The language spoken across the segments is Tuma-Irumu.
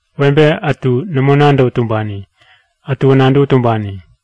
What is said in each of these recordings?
Webe ätu nämo nadäwä tumbani, ätuwä nadäwä tumbani.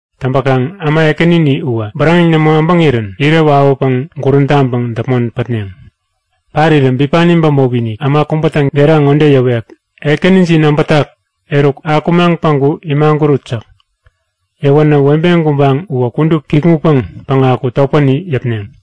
Täŋpäkaŋ äma ekänini uwä bäräŋeŋ nämo äbäŋirän irä wawäpäŋ gurän täŋpäŋ däpmon patneŋ. Parirä bipani bämopi-inik äma kubätä gera ŋode yäwek; Ekänijin äbätak! Eruk, akumaŋ päŋku imagurut! yäk. Yäwänä webe gubaŋ uwä kudup kikŋutpäŋ päŋaku topäni yäpneŋ.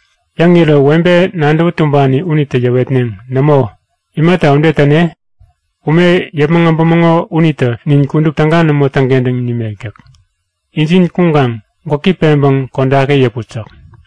Yäŋirä webe nadäwä tumbani unitä yäwetneŋ; Nämo, imata ude täne? Ume yäpmäŋ äbämäŋo unitä nin kudup täga nämo täŋkentäŋ nimek yäk. Injin kuŋkaŋ gwäki peŋpäŋ kodaki yäput yäk.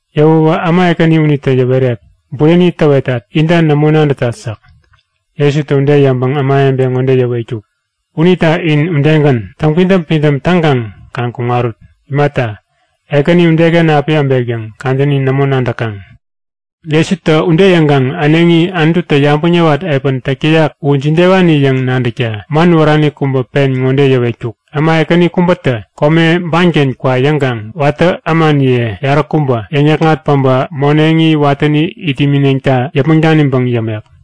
Yäwäwä äma ekäni unitä yäwerek; Bureni täwetat! Inta nämo nadätat yäk. Jesutä ude yäŋpäŋ ämawebe ŋode yäwetkuk; Unita in udegän, täŋpidäm-pidäm taŋkaŋ kaŋ kuŋarut. Imata, Ekäni udeken api äbek yäŋ kadäni nämo nadäkaŋ. Jesutä ude yäŋkaŋ äneŋi Anututä yabäŋ yäwat epän täk täyak u jidewani yäŋ nadäkta man wärani kubä pen ŋode yäwetkuk; Äma ekäni kubätä kome banken kwa yäŋkaŋ watä ämaniye yaräkubä yäŋ-yäkŋat päbä moneŋi watäni it imineŋta yäpmäŋ daniŋpäŋ yämek.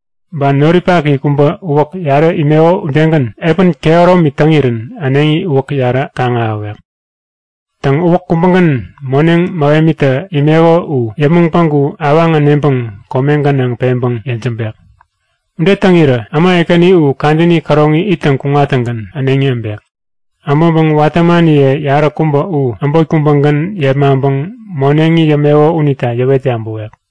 Ba noripaki kubä uwä yarä imeko udegän epäni kehäromi täŋirän äneŋi uwäk yarä kaŋ-ahäwek. Täŋ, uwäk kubägän moneŋ mähemitä imeko u yäpmäŋ päŋku awaŋ äneŋpäŋ kome gänaŋ peŋpäŋ yejämbek. Ude täŋirä äma ekäni u kadäni käroŋi ittäŋ kuŋattäŋgän äneŋi äbek. Äbäŋpäŋ watä ämaniye yaräkubä u äbot kubägän yepmaŋpäŋ moneŋi yämeko unita yäwet yabäwek.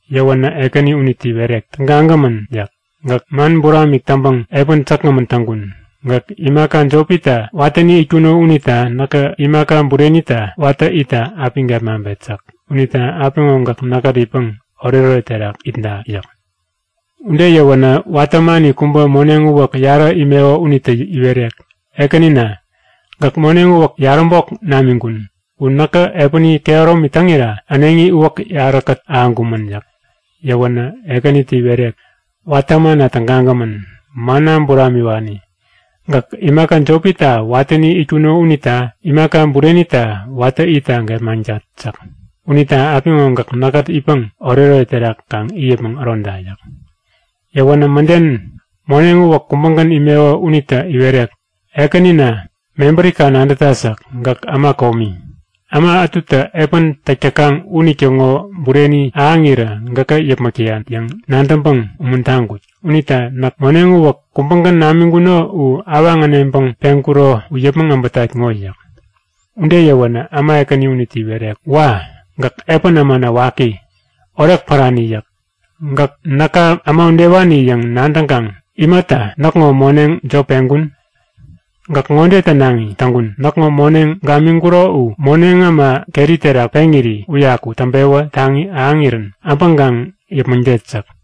Yäwänä ekäni unitä iwerek; Tägagämän yäk. Gäk man buramik täŋpäŋ epän säkgämän täŋkun. Gäk imaka jopita watäni itkuno unita näkä imaka burenita watä itta api gepmaŋpet yäk. Unita apiŋo gäk näkkät itpäŋ oretoret terak itda yäk. Ude yäwänä watä ämani kubä moneŋ uwäk yarä imeko unitä iwerek; Ekänina, gäk moneŋ uwäk yaräbok namiŋkun. U näkä epäni kehäromi täŋira äneŋi uwäk yaräkät ahäŋkumän yäk. Yäwänä ekänitä iwerek; Watä ämana tägagämän! Manna buramiwani, gäk imaka jopita watäni itkuno unita imaka burenita watä itta gepmaŋtat yäk. Unita apiŋo gäk näkkät itpäŋ oretoret terak kaŋ it yäpmäŋ äroda yäk. Yäwänä mäden moneŋ uwäk kubägän imeko unitä iwerek; Ekänina, mebärika nadätat yäk. Gäk äma komi. Äma ätutä epän täk täkaŋ unitäŋo bureni ahäŋirä gäkä yäpmäk täyan yäŋ nadäŋpäŋ umuntaŋkut. Unita näk moneŋ uwäk kubägän namiŋkuno u awaŋ äneŋpäŋ peŋkuro u yäpmäŋ äbätat ŋo! yäk. Ude yäwänä äma ekäni unitä iwerek; Wa! Gäk epän ämana waki, orek pärani yäk. Gäk näka äma udewani yäŋ nadäŋkaŋ imata näkŋo moneŋ jop peŋkun? Gäk ŋode tänaŋi täŋkun; Näkŋo moneŋ gamiŋkuro u moneŋ äma keri terak peŋiri uyaku täŋpewä taŋi ahäŋirän äbäŋkaŋ yäpmäŋtet yäk.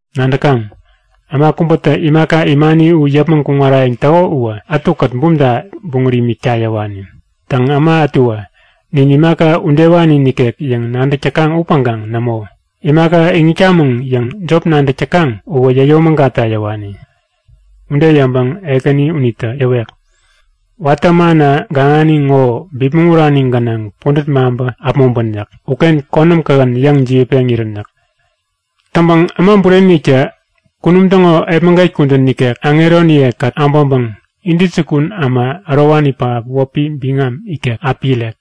Nadäkaŋ? Äma kubätä imaka imani u yäpmäŋ kuŋarayäŋ täko uwä ätukät bumta-inik buŋät imikta yäwani. Täŋ, äma ätuwä nin imaka udewani nikek yäŋ nadäk täkaŋ upäŋkaŋ nämo! Imaka iŋitkamäŋ yäŋ jop nadäk täkaŋ uwä yäyomägatta yäwani. Ude yäŋpäŋ ekäni unitä yäwek; Watä ämana gaŋani ŋo bipmäŋ urani gänaŋ pudät maŋpä äpmoŋpän yäk. Uken konäm kähän yäŋ jiwätpeŋ irän yäk. Täŋpäŋ Äma Bureni-iniktä kunum täŋo epmäget kudän nikek aŋeroniye-kät äbäŋpäŋ intäjukun äma ärowani pähap wäpi biŋam ikek api irek.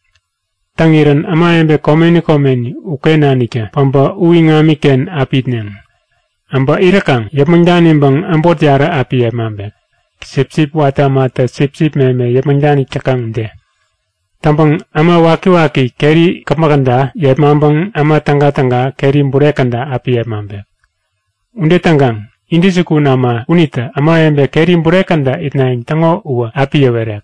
Täŋirän ämawebe komeni komeni uken naniktä päbä u iŋamiken api itneŋ. Äbä iräkaŋ yäpmäŋ daniŋpäŋ äbot yarä api yepmaŋpek, sipsip watä ämatä sipsip meme yäpmäŋ danik täkaŋ ude. Täŋpäŋ äma wakiwaki keri käpmäk käda yepmaŋpäŋ äma tägatäga keri bure käda api yepmaŋpek. Ude täŋkaŋ intäjukun äma unitä ämawebe keri bure käda itnayäŋ täŋo uwä api yäwerek;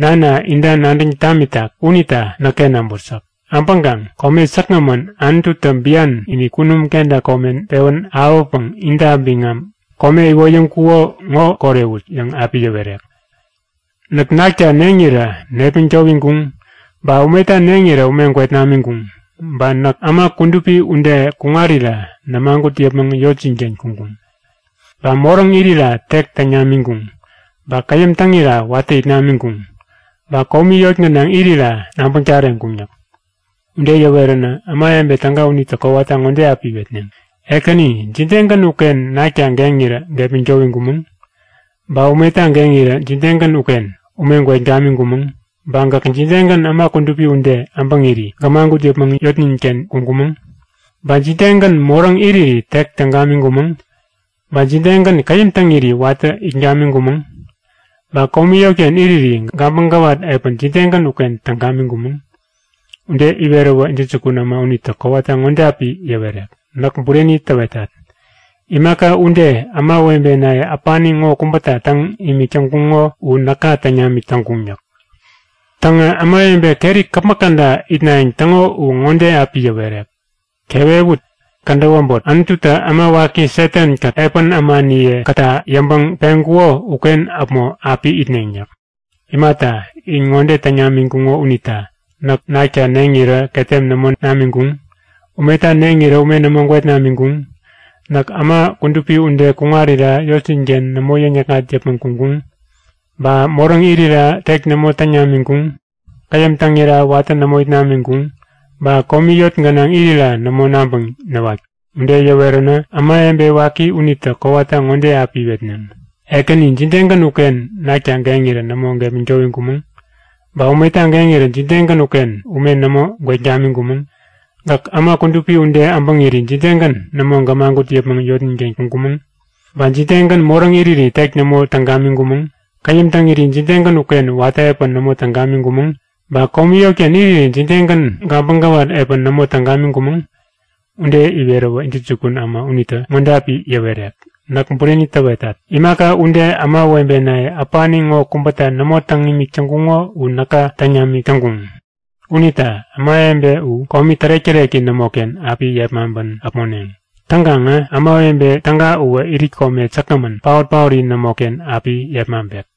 Nana inta nadäŋ tamitak unita näkken äbut yäk. Äbäŋkaŋ kome säkgämän Anututä bian-inik kunum kenta kome pewän ahäwäpäŋ inta biŋam kome iwoyäŋkuko ŋo korewut yäŋ api yäwerek. Näk nakta neŋirä nepmäŋ towiŋkuŋ, ba umeta neŋirä ume gwet namiŋkuŋ. Ba näk äma kudupi ude kuŋarira nämagut yäpmäŋ yotjin-ken kuŋkuŋ. Ba moräŋ irira tek täŋ namiŋkuŋ. Ba käyäm täŋira watä it namiŋkuŋ. Ba komi yot gänaŋ irira nabäŋ tareŋkuŋ yäk. Ude yäweränä ämawebe täga unitä kowata ŋode api iwetneŋ; Ekäni, jidegän uken nakta geŋirä gepmäŋ towiŋkumäŋ? Ba umeta geŋirä jidegän uken ume gwet gamiŋkumäŋ? Ba gäk jidegän äma kudupi ude äbäŋiri gämagut yäpmäŋ yotnin-ken kuŋkumäŋ? Ba jidegän moräŋ iriri tek täŋ gamiŋkumäŋ? Ba jidegän käyäm täŋiri watä it gamiŋkumäŋ? Ba komi yotken iriri gabäŋ gäwat epän jidegän uken täŋ gamiŋkumäŋ? Ude iweräwä intäjukun äma unitä kowata ŋode api yäwerek; Näk bureni täwetat. Imaka ude ämawebenaye äpani ŋo kubäta täŋ imik täŋkuŋo u näka täŋ namik täŋkuŋ yäk. Täŋä ämawebe keri käpmäk käda itnayäŋ täŋo uwä ŋode api yäwerek; Kewewut! Kädäp äbot Anututä äma waki Satan-kät epän ämaniye-kätta yäŋpäŋ peŋkuko uken äpmo api itneŋ yäk. Imata, in ŋode täŋ namiŋkuŋo unita; Näk nakta neŋirä ketem nämo namiŋkuŋ. Umeta neŋirä ume nämo gwet namiŋkuŋ. Näk äma kudupi ude kuŋarira yotjin-ken nämo yäŋ-yäkŋat yäpmäŋ kuŋkuŋ. Ba moräŋ irira tek nämo täŋ namiŋkuŋ. Käyäm täŋira watä nämo it namiŋkuŋ. Ba komi yot gänaŋ irira nämo nabäŋ näwatkuŋ. Ude yäweränä ämawebe waki unitä kowata ŋode api iwetneŋ; Ekäni, jidegän uken nakta geŋirä nämo gepmäŋ towiŋkumäŋ? Ba umeta geŋirä jidegän uken ume nämo gwet gamiŋkumäŋ? Gäk äma kudupi ude äbäŋiri jidegän nämo gämagut yäpmäŋ yotnin-ken kuŋkumäŋ? Ba jidegän moräŋ iriri tek nämo täŋ gamiŋkumäŋ? Käyäm täŋiri jidegän uken watä epän nämo täŋ gamiŋkumäŋ? Ba komi yotken iriri jidegän gabäŋ gäwat epän nämo täŋ gamiŋkumäŋ? Ude iweräwä intäjukun äma unitä ŋode api yäwerek; Näk bureni täwetat. Imaka ude ämawebenaye äpani ŋo kubäta nämo täŋ imik täŋkuŋo u näka täŋ namik täŋkuŋ. Unita ämawebe u komi tärek-täreki nämoken api yepmaŋpän äpmoneŋ. Täŋkaŋä ämawebe täga uwä irit kome säkgämän paot-paori nämoken api yepmaŋpek.